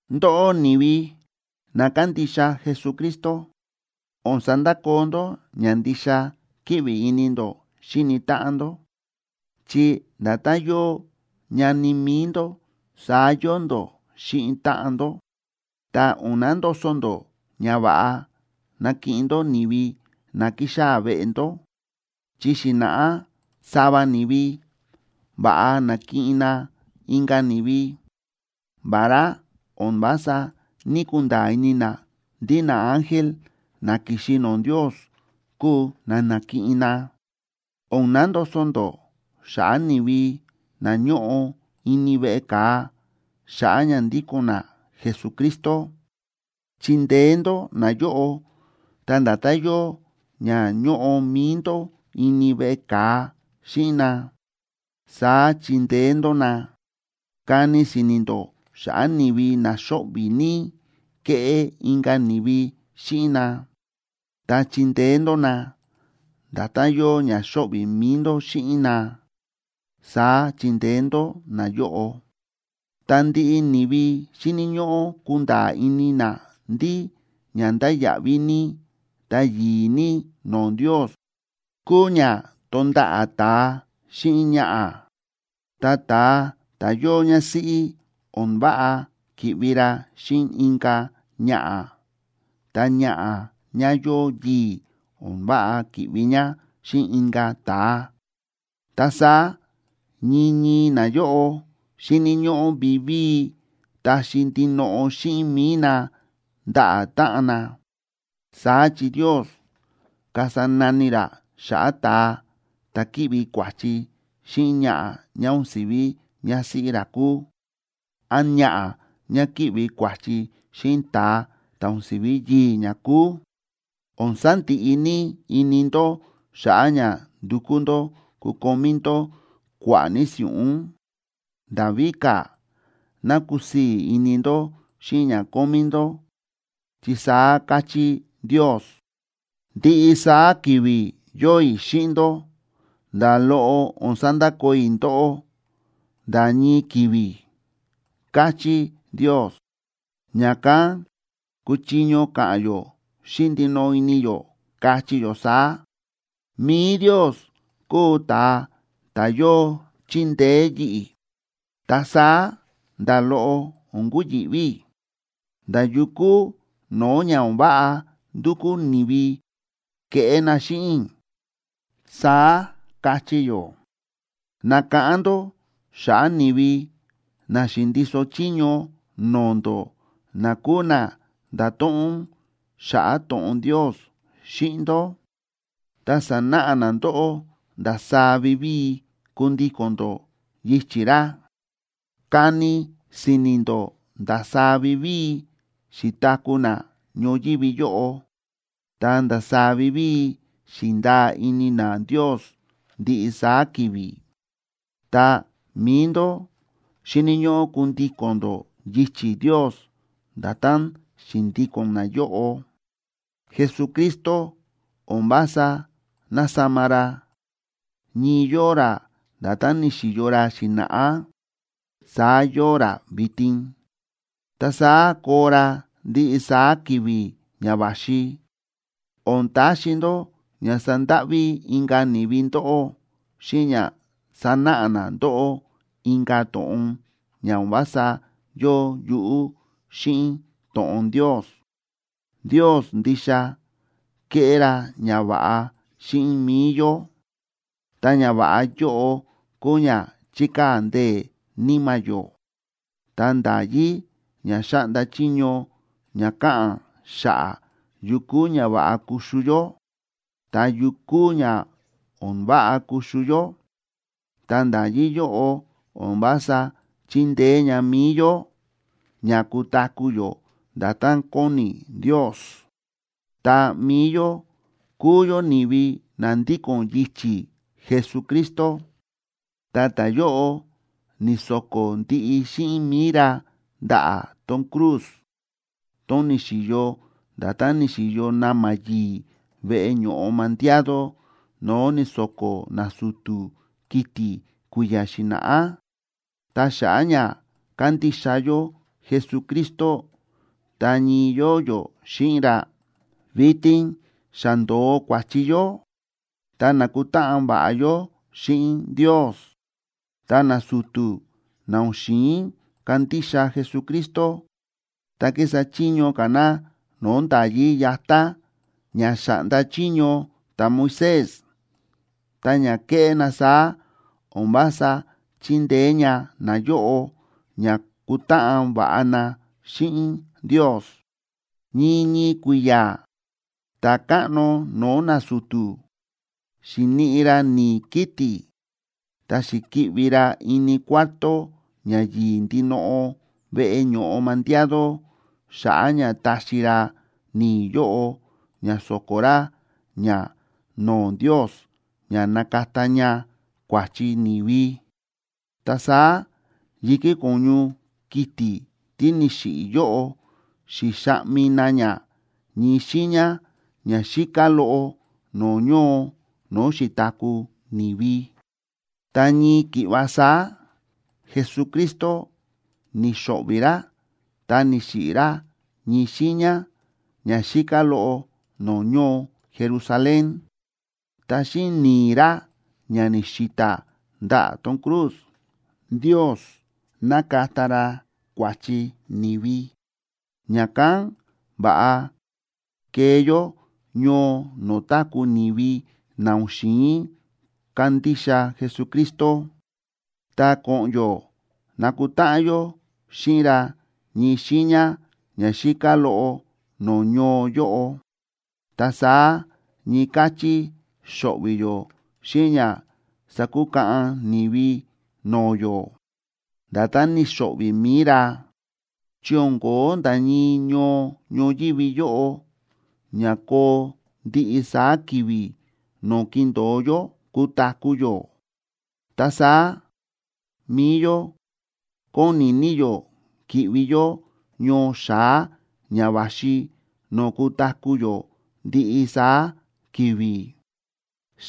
Ndóꞌó ni̱vi na kándixa Jesucristo, o̱n sandakoo ndó ña ndixa kíꞌvi ini ndó xíni táꞌan ndó, chi nda̱tán yóo ñani mi̱i ndó saá yóo ndó xíꞌin táꞌan ndó. Ta o̱n nandoso ndó ña va̱ꞌa nakiꞌin ndó ni̱vi na kixaa̱ veꞌe ndó. Chi xi̱na̱ꞌá sava ni̱vi va̱ꞌa na̱kiꞌin na inka̱ ni̱vi, vará o̱n vása ní‑kunda̱a̱ ini na ndí naángel na ki̱xi no̱o̱ Ndios kúu na na̱kiꞌin na. O̱n nandoso ndó xa̱ꞌa̱ ni̱vi na ñóꞌo ini veꞌe ka̱a xa̱ꞌa̱ ña ndíko̱n na Jesucristo. Chindeé ndó nayóꞌo, ta nda̱tán yóo ña ñóꞌo mi̱i ndó ini veꞌe ka̱a xíꞌin na, saá chindeé ndó na. Kani si̱ni̱ ndó xa̱ꞌa̱ ni̱vi na xóꞌvi̱ ní kéꞌé inka̱ ni̱vi xíꞌin na, ta chindeé ndó na, nda̱tán yóo ña xóꞌvi̱ mi̱i ndó xíꞌin na, saá chindeé ndó nayóꞌo. Ta ndiꞌi ni̱vi xíni̱ ñóꞌó kunda̱a̱ ini na ndí ña ndáya̱ꞌví ní ta yi̱i̱ ní no̱o̱ Ndios kúu ña tonda̱ꞌa̱ ta̱a xíꞌin ñaꞌa̱. Ta ta̱a ta̱ yóo ñásíꞌí o̱n váꞌa ki̱ꞌvi ra xíꞌin inka̱ ñaꞌa̱, ta ñaꞌa̱ ñá yóo yii̱ o̱n váꞌa ki̱ꞌvi ñá xíꞌin inka̱ ta̱a. Ta saá ñii ñii nayóꞌo xíni̱ ñóꞌó vivíi taxi ndinoꞌo xíꞌin mi̱i na ndaꞌa̱ táꞌan na. Saá chi Ndios kasa nani ra xa̱ꞌa̱ ta̱a ta̱ kíꞌvi kua̱chi xíꞌin ñaꞌa̱ ñá o̱n si̱ví ñásíꞌí ra kúu, án ñaꞌa̱ ñá kíꞌvi kua̱chi xíꞌin ta̱a ta̱ o̱n si̱ví yii̱ ñá kúu. O̱n sandiꞌi ní ini ndó xa̱ꞌa̱ ña ndukú ndó kukomí ndó kua̱ꞌa̱ ní si̱ꞌún. Nda̱ víka̱, ná kusii̱ ini ndó xíꞌin ña kómí ndó, chi saá káchí Ndios: “Ndiꞌi saá ki̱vi̱ yóo i̱ xíꞌin ndó. Nda̱ loꞌo o̱n sandakoo i̱ ndóꞌó nda̱ ñii ki̱vi̱”, káchí Ndios. Ña̱kán kúchiño ka̱ꞌa̱n yó xíꞌin ndinoꞌo ini yó, kachí yó saá: “Mi̱i Ndios kúu ta̱a ta̱ yóo chíndeé yi̱ꞌi̱, ta saá nda̱ loꞌo o̱n kuyi̱ꞌví i̱ nda̱ yukú no̱o̱ ña o̱n váꞌa ndukú ni̱vi keꞌé na xíꞌin i̱”, saá kachí yó. Nakáꞌán ndó xa̱ꞌa̱ ni̱vi na xi̱ndiso chiño no̱o̱ ndó na kúu na nda̱to̱ꞌon xa̱ꞌa̱ to̱ꞌon Ndios xíꞌin ndó, ta sa̱náꞌa na ndóꞌó ndasaá vivíi kundíko̱n ndó yichi̱ ra. Kani si̱ni̱ ndó ndasaá vivíi xi̱taku̱ na ñoyívi yóꞌo, ta ndasaá vivíi xi̱ndaa ini na Ndios ndiꞌi saá ki̱vi̱. Ta mi̱i ndó xíni̱ ñóꞌó kundíko̱n ndó yichi̱ Ndios nda̱tán xi̱ndíko̱n nayóꞌo. Jesucristo o̱n vása násama ra. Ñii yóo ra nda̱tán ni̱xi̱yo ra xi̱na̱ꞌá, saá yóo ra vitin, ta saá koo ra ndiꞌi saá ki̱vi̱ ña va̱xi. O̱n taxi ndó ña sandáꞌví inka̱ ni̱vi ndóꞌó xíꞌin ña sánáꞌa na ndóꞌó inka̱ to̱ꞌon ña o̱n vása yóo yuꞌú xíꞌin to̱ꞌon Ndios. Ndios ndixa kéꞌé ra ñava̱ꞌa xíꞌin mi̱i yó, ta ñava̱ꞌa yóꞌo kúu ña chíkaa̱ ndee̱ níma̱ yó. Ta nda̱yí ña xáꞌnda chiño ña káꞌa̱n xa̱ꞌa̱ yu kúu ña va̱ꞌa kuxu yó, ta yu kúu ña o̱n váꞌa kuxu yó, ta nda̱yí yóꞌo o̱n vása chíndeé ña mi̱i yó ña kutaku̱ yó nda̱tán kóni Ndios. Ta mi̱i yó kúu yó ni̱vi na ndíko̱n yichi̱ Jesucristo, ta ta̱yóꞌo ni̱so̱ko̱ ndiꞌi xíꞌin mi̱i ra ndaꞌa̱ tón cruz, tón ni̱xi̱yo nda̱tán ni̱xi̱yo na̱ma̱ yi̱i̱ veꞌe ño̱ꞌo mandiado no̱o̱ ni̱so̱ko̱ nasu̱tu̱ kiti̱ kui̱ya̱ xi̱na̱ꞌá. Ta xa̱ꞌa̱ ña kándixa yó Jesucristo ta ñii yóo yó xíꞌin ra, vitin xa ndo̱o kua̱chi yó, ta nákutáꞌan va̱ꞌa yó xíꞌin Ndios. Ta nasu̱tu̱ na o̱n xi̱in kandixa Jesucristo, ta kísa chiño ka̱ na no̱o̱ nda̱yí yatá ña xa̱ꞌnda chiño ta̱Moisés, ta ña kéꞌé na saá o̱n vása chíndeé ña nayóꞌo ña kutáꞌan va̱ꞌa na xíꞌin Ndios. Ñii ñii kui̱ya̱ ta̱káꞌno no̱o̱ nasu̱tu̱ xi̱niꞌi ra ni̱i̱ kiti̱ ta xi̱ki̱ꞌvi ra ini Cuarto Ña Yi̱i̱ Ndinoꞌo veꞌe ño̱ꞌo mandiado xa̱ꞌa̱ ña taxi ra ni̱i̱ yóꞌo ña so̱ko̱ ra ña no̱o̱ Ndios ña nakata ña kua̱chi ni̱vi; ta saá yi̱kí ko̱ñu kiti̱ tí ni̱xiꞌi̱ yóꞌo xi̱xaꞌmi na ña ñii xiiña ña xíká loꞌo no̱o̱ ñoo no̱o̱ xi̱taku̱ ni̱vi. Ta ñii ki̱ꞌva saá, Jesucristo ni̱xo̱ꞌvi̱ ra ta ni̱xiꞌi̱ ra ñii xiiña ña xíká loꞌo no̱o̱ ñoo Jerusalén. Ta xíꞌin ni̱i̱ ra ña ni̱xi̱ta̱ ndaꞌa̱ tón cruz, Ndios nákata ra kua̱chi ni̱vi. Ña̱kán va̱ꞌa kee yó ñoo no̱o̱ táku̱ ni̱vi na o̱n xi̱in kandixa Jesucristo, ta ko̱ꞌo̱n yó nakutáꞌan yó xíꞌin ra ñii xiiña ña xíká loꞌo no̱o̱ ñoo yóꞌo. Ta saá ñii káchí xo̱ꞌvi̱ yó xíꞌin ña sakukaꞌan ni̱vi no̱o̱ yó, nda̱tán ni̱xo̱ꞌvi̱ mi̱i ra. Chi o̱n ko̱ó nda̱ ñii ñoo ñoyívi yóꞌo ña koo ndiꞌi saá ki̱vi̱ no̱o̱ kindo̱o yó kutaku̱ yó. Ta saá mi̱i yó kóni ní yó ki̱ꞌvi yó ñoo xa̱á ña va̱xi no̱o̱ kutaku̱ yó ndiꞌi saá ki̱vi̱.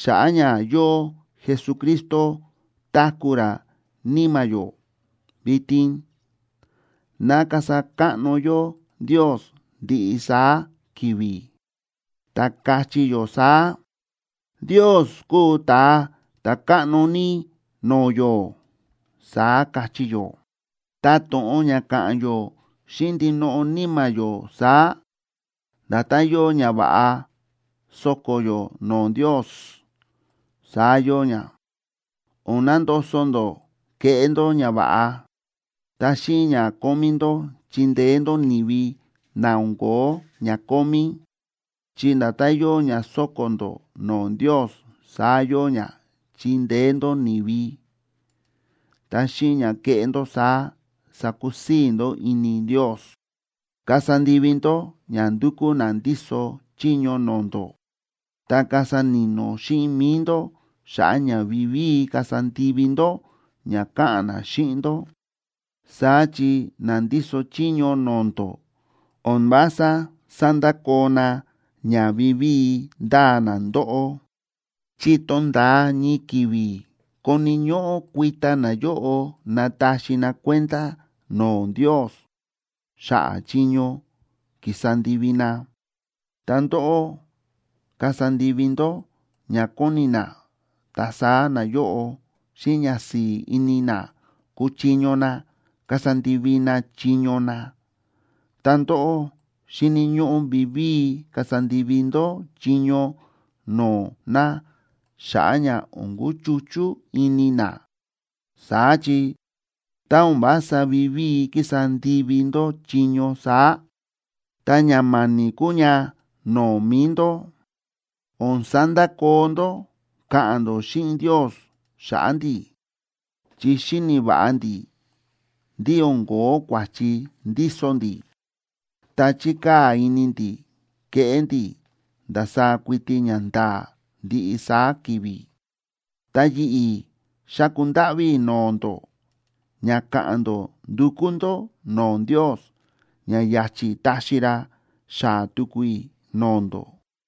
Xa̱ꞌa̱ ña yóo Jesucristo táku̱ ra níma̱ yó vitin, ná kasa káꞌno yó Ndios ndiꞌi saá ki̱vi̱, ta kachí yó saá: “Ndios kúu ta̱a ta̱káꞌno ní no̱o̱ yó”, saá kachí yó. Ta to̱ꞌon ña káꞌa̱n yó xíꞌin ndinoꞌo níma̱ yó saá, nda̱tán yóo ñava̱ꞌa sóko̱ yó no̱o̱ Ndios, saá yóo ña. O̱n nandoso ndó keꞌé ndó ñava̱ꞌa, ta xíꞌin ña kómí ndó chindeé ndó ni̱vi na o̱n ko̱ó ña kómí, chi nda̱tán yóo ña sóko̱ ndó no̱o̱ Ndios, saá yóo ña chíndeé ndó ni̱vi, ta xíꞌin ña kéꞌé ndó saá sákusii̱ ndó ini Ndios. Kasa ndivi ndó ña ndúkú na ndíso chiño no̱o̱ ndó, ta kasa ni̱no̱ xíꞌin mi̱i ndó xa̱ꞌa̱ ña vivíi kasa ndivi ndó ña káꞌa̱n na xíꞌin ndó. Saá chi na ndíso chiño no̱o̱ ndó o̱n vása sándakoo na ña vivíi ndáa na ndóꞌó, chi tonda̱a ñii ki̱vi̱ koni̱ ñóꞌó kuita nayóꞌo nataxi na kuenda no̱o̱ Ndios xa̱ꞌa̱ chiño ki̱sa ndivi na. Ta ndóꞌó kasa ndivi ndó ña kóni na, ta saá nayóꞌo xíꞌin ñasi̱i̱ ini na kuchiño na kasa ndivi na chiño na. Ta ndóꞌó xíni̱ ñóꞌó vivíi kasa ndivi ndó chiño no̱o̱ na xa̱ꞌa̱ ña o̱n kuchuchú ini na. Saá chi, tá o̱n vása vivíi kísa ndivi ndó chiño saá, ta ña ma̱ni̱ kúu ña no̱o̱ mi̱i ndó. O̱n sandakoo ndó káꞌa̱n ndó xíꞌin Ndios xa̱ꞌa̱ ndi̱. Chi xíni̱ va̱ꞌa ndi̱ ndí o̱n ko̱ó kua̱chi ndíso ndi̱, ta chíkaa̱ ini ndi̱ keꞌé ndi̱ ndasaá kuiti ñanda̱a̱ ndiꞌi saá ki̱vi̱. Ta yi̱ꞌi̱ xáku ndáꞌví i̱ no̱o̱ ndó ña ka̱ꞌa̱n ndó ndukú ndó no̱o̱ Ndios, ña ya̱chi̱ taxi ra xaa̱ tuku i̱ no̱o̱ ndó.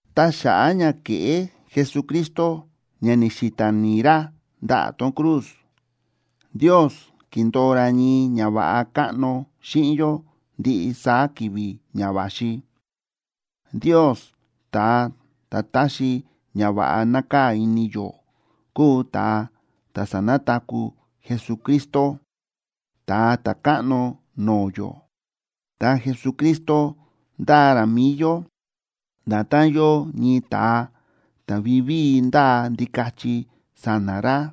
Ta xa̱ꞌa̱ ña ke̱ꞌé Jesucristo ña ni̱xi̱ta̱ ni̱i̱ ra ndaꞌa̱ tón cruz, Ndios ki̱ndo̱o ra ñii ñava̱ꞌa káꞌno xíꞌin yó ndiꞌi saá ki̱vi̱ ña va̱xi. Ndios ta̱a ta̱ táxi ñava̱ꞌa nákaa̱ ini yó kúu ta̱a ta̱ sa̱nataku̱ Jesucristo, Ta̱a Ta̱káꞌno no̱o̱ yó. Ta Jesucristo ndáa ra mi̱i yó nda̱tán yóo ñii ta̱a ta̱ vivíi ndáa ndikachi sa̱na̱ ra.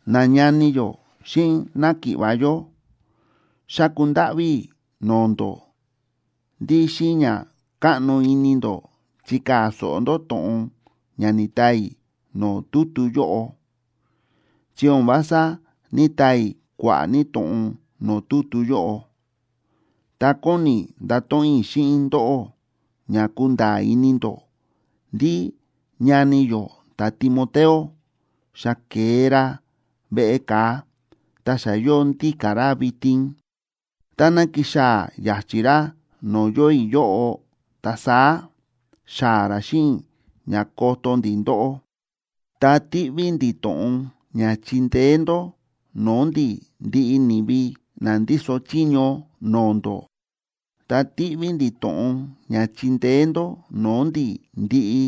Nañani yó xíꞌin náki̱ꞌva̱ yó, xáku ndáꞌví i̱ no̱o̱ ndó, ndí xíꞌin ña káꞌno ini ndó chikaa̱ so̱ꞌo ndó to̱ꞌon ña ni̱taa i̱ no̱o̱ tutu yóꞌo. Chi o̱n vása ní‑taa i̱ kua̱ꞌa̱ ní to̱ꞌon no̱o̱ tutu yóꞌo. Ta kóni i̱ ndato̱ꞌon i̱ xíꞌin ndóꞌó ña kunda̱a̱ ini ndó ndí ñani yó ta̱Timoteo, xa ke̱e ra veꞌe ka̱a ta xa yóo ndíka̱ ra vitin. Táná kixaa̱ ya̱chi̱ ra no̱o̱ yóo i̱ yóꞌo, ta saá xaa̱ ra xíꞌin i̱ ña koto ndi̱ ndóꞌó. Ta tíꞌví ndi̱ to̱ꞌon ña chindeé ndó no̱o̱ ndi̱ ndiꞌi ni̱vi na ndíso chiño no̱o̱ ndó, ta tíꞌví ndi̱ to̱ꞌon ña chindeé ndó no̱o̱ ndi̱ ndiꞌi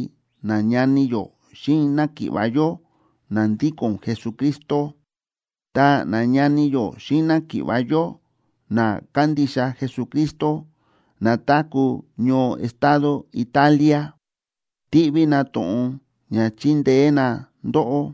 nañani yó xíꞌin náki̱ꞌva̱ yó na ndíko̱n Jesucristo. Ta nañani yó xíꞌin náki̱ꞌva̱ yó na kándixa Jesucristo, na táku̱ ñoo estado Italia, tíꞌví na to̱ꞌon ña chindeé na ndóꞌó.